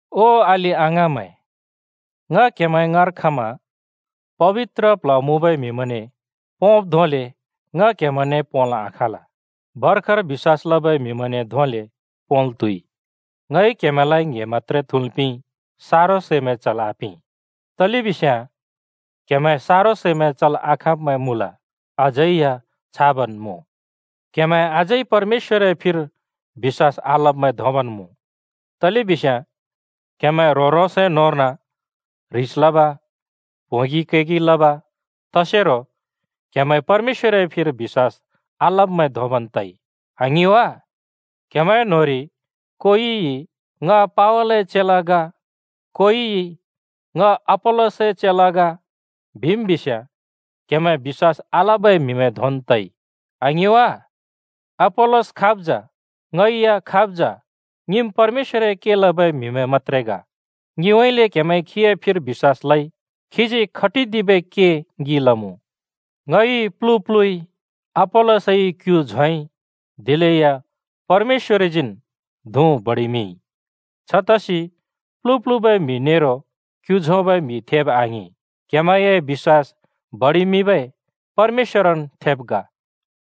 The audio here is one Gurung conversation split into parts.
ओ अलि-अङाँमैं, ङ क्‍हेमैं ङाँर खमा पबित्र प्ल्ह मुँबै म्हिमैंने पोंब् धोंले ङ क्‍हेमैंने पोंल् आखाँल, भर्खर बिश्‍वास लबै म्हिमैंने धोंले पोंल् त्हुइ। ङइ क्‍हेमैंलाइ ङ्‍हे मत्‍त्रे थुँल् पिंइ, सारो सैमैं चल् आपिं, तलेबिस्याँ क्हेमैं सारो सैमैं चल् आखाँब्मैं मुँल, अझै या छाबन् मुँ। क्‍हेमैं अझै परमेश्‍वरए फिर बिश्‍वास आलब्मैं धोंबन् मुँ। तलेबिस्याँ क्‍हेमैं ह्रों-ह्रोंसए न्होंर्न ह्रिस लब, प्होंगि कैगि लब तसेरो क्हेमैं परमेश्‍वरए फिर बिश्‍वास आलब्मैं धोंन् तइ, आङिं वा? क्‍हेमैं न्‍होंरि कोइइ “ङ पावलए चेला ग,” कोइइ “ङ अपोल्‍लसए चेला ग” बिम् बिस्याँ, क्‍हेमैं बिश्‍वास आलबै म्‍हिमैं धोंन् तइ, आङिं वा? अपोल्‍लोस खाब् जा? ङै या खाब् जा? ङिम् परमेश्‍वरए के लबै म्‍हिमैं मत्‍त्रे ग। ङिउँइँले क्‍हेमैंइ खीए फिर बिश्‍वास लइ। खीजी खटिदिबै के ङि लमुँ। ङइ प्‍लु प्‍लुइ, अपोल्‍लसइ क्‍यु झोंइ, दिलेया परमेश्‍वरजीन् धुँ बडिमिंइ। छतसि प्‍लु प्‍लुबै म्‍हि नेरो क्‍यु झोंबै म्‍हि थेब आङिं, क्हेमैंए बिश्‍वास बडिमिंबै परमेश्‍वरन् थेब ग।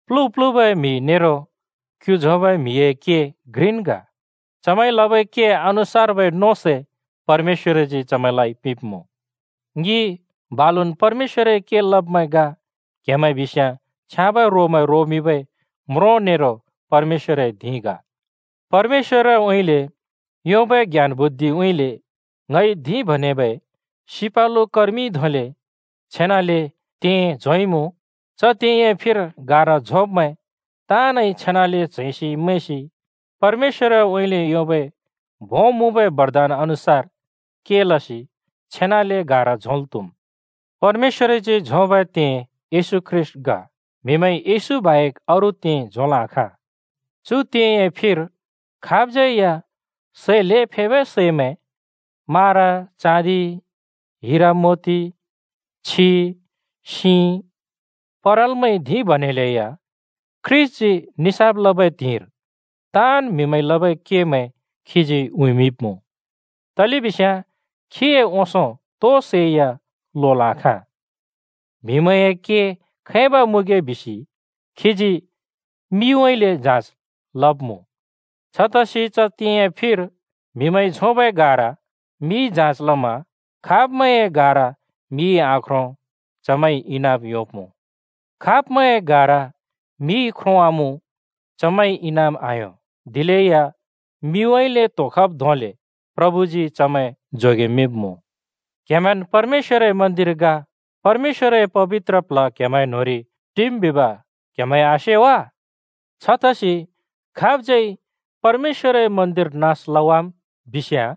प्‍लु प्‍लुबै म्‍हि नेरो क्‍यु झोंबै म्‍हिए के घ्रिन् ग। चमैंइ लबै के अनुसार्बै नों सै परमेश्‍वरजी चमैंलाइ पिंब्मुँ। ङि बालुन् परमेश्‍वरए के लब्मैं ग, क्‍हेमैं बिस्याँ छ्याँबै रोमैं रोमिंबै म्रों नेरो परमेश्‍वरए धिं ग। परमेश्‍वरउँइँले योंबै ज्ञान बुद्धिउँइँले ङइ धिं बनेबै सिपालु कर्मिइ धोंले छेनाले तें (जग) झोंइमुँ। च तेंए फिर गारा झोंब्मैं ताँनइ छेनाले च्हैंसि मैंसि परमेश्‍वरउँइँले योंबै भों मुँबै बरदान अनुसार के लसि छेनाले गारा झोंल् त्हुम्। परमेश्‍वरजी झोंबै तें येशू ख्रीष्‍ट ग। म्हिमैंइ येशू बाहेक अरू तें झोंल् आखाँ। चु तेंए फिर खाबज्यै या सै ल्हें फेबै सैमैं, मारा, चाँदि हिरा मोति, छि, सिं परालमैंइ धिं बनेलैया, ख्रीष्‍टजी निसाफ लबै त्हिंइर ताँन् म्हिमैंइ लबै केमैं खीजी उँइँमिंब्मुँ। तलेबिस्याँ खीए ओंसों तोइ सै या लोल् आखाँ। म्हिमैंए के खैब मुँगे बिसि खीजी मिउँइँले जाँच लब्मुँ। छतसि च तेंए फिर म्हिमैंइ झोंबै गारा मिइ जाँच लमा खाब्मैंए गारा मिइ आख्रों चमैंइ इनाम योंब्‍मुँ। खाब्मैंए गारा मिइ ख्रोंवामुँ चमैंइ इनाम आयों, दिलेया मिउँइँले त्होंखब् धोंले प्रभुजी चमैं जोगेमिंब्मुँ। क्‍हेमैंन् परमेश्‍वरए मन्दिर ग, परमेश्‍वरए पबित्र प्ल्ह क्‍हेमैंए न्‍होंरि टिम् बिब क्हेमैंइ आसे वा? छतसि खाबज्‍यै परमेश्‍वरए मन्दिर नास लवाम् बिस्याँ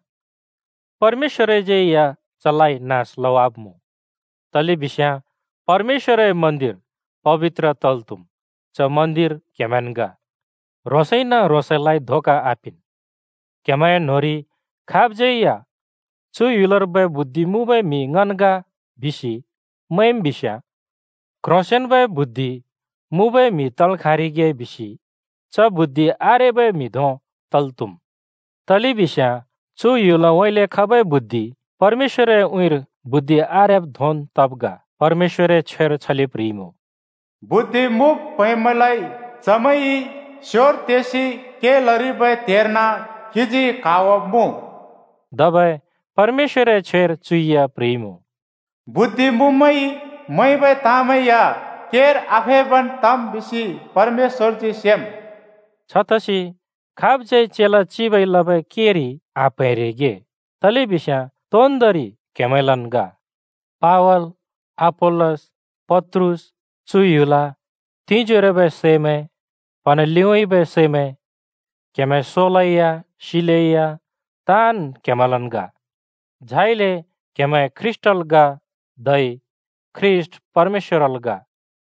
परमेश्‍वरज्यै या चलाइ नास लवाब्‍मुँ, तलेबिस्याँ परमेश्‍वरए मन्दिर पबित्र तल् त्हुम्, च मन्दिर क्हेमैंन् ग। ह्रोंसैन ह्रोंसलाइ धोका आपिंन्: क्हेमैंए न्होंरि खाबज्‍यै या “चु ह्‍युलर्बै बुद्धि मुँबै म्हि ङन् ग” बिसि मैंम् बिस्याँ क्ह्रोंसेंन्बै बुद्धि मुँबै म्हि तल् खाँरिगे बिसि च बुद्धि आरेबै म्हि धों तल् त्हुम्। तलेबिस्याँ चु ह्‍युलउँइँले खबै बुद्धि परमेश्‍वरए उँइँर बुद्धि आरेब् धोंन् तब् ग। परमेश्‍वरए छ्वेर छले प्ह्रिइमुँ, “बुद्धि मुँब् प्हैंब्मैंलाइ चमैंइ स्योर तेसि के लरिबै त्हेर्न खीजी क्हावाब्मुँ।” धबै परमेश्‍वरए छ्वेर चु या प्ह्रिइमुँ, “बुद्धि मुँब्मैंइ मैंबै ताँमैं या केर आफेबन् तम् बिसि परमेश्‍वरजी सेम्।” छतसि खाबज्यै चेला चिबइ लबै केरि आप्‍हैंरिगे, तलेबिस्याँ तोन्दोंरि क्‍हेमैंलन् ग: पावल, अपोल्‍लस, पत्रुस, चु ह्‍युल, तिंजोरोबै सैमैं, प्‍हँना लिउँइँबै सैमैं, क्हेमैं सोलेया, सिलेया — ताँन् क्‍हेमैंलन् ग। झाइले क्‍हेमैं ख्रीष्‍टल् ग, धै ख्रीष्‍ट परमेश्‍वरल् ग।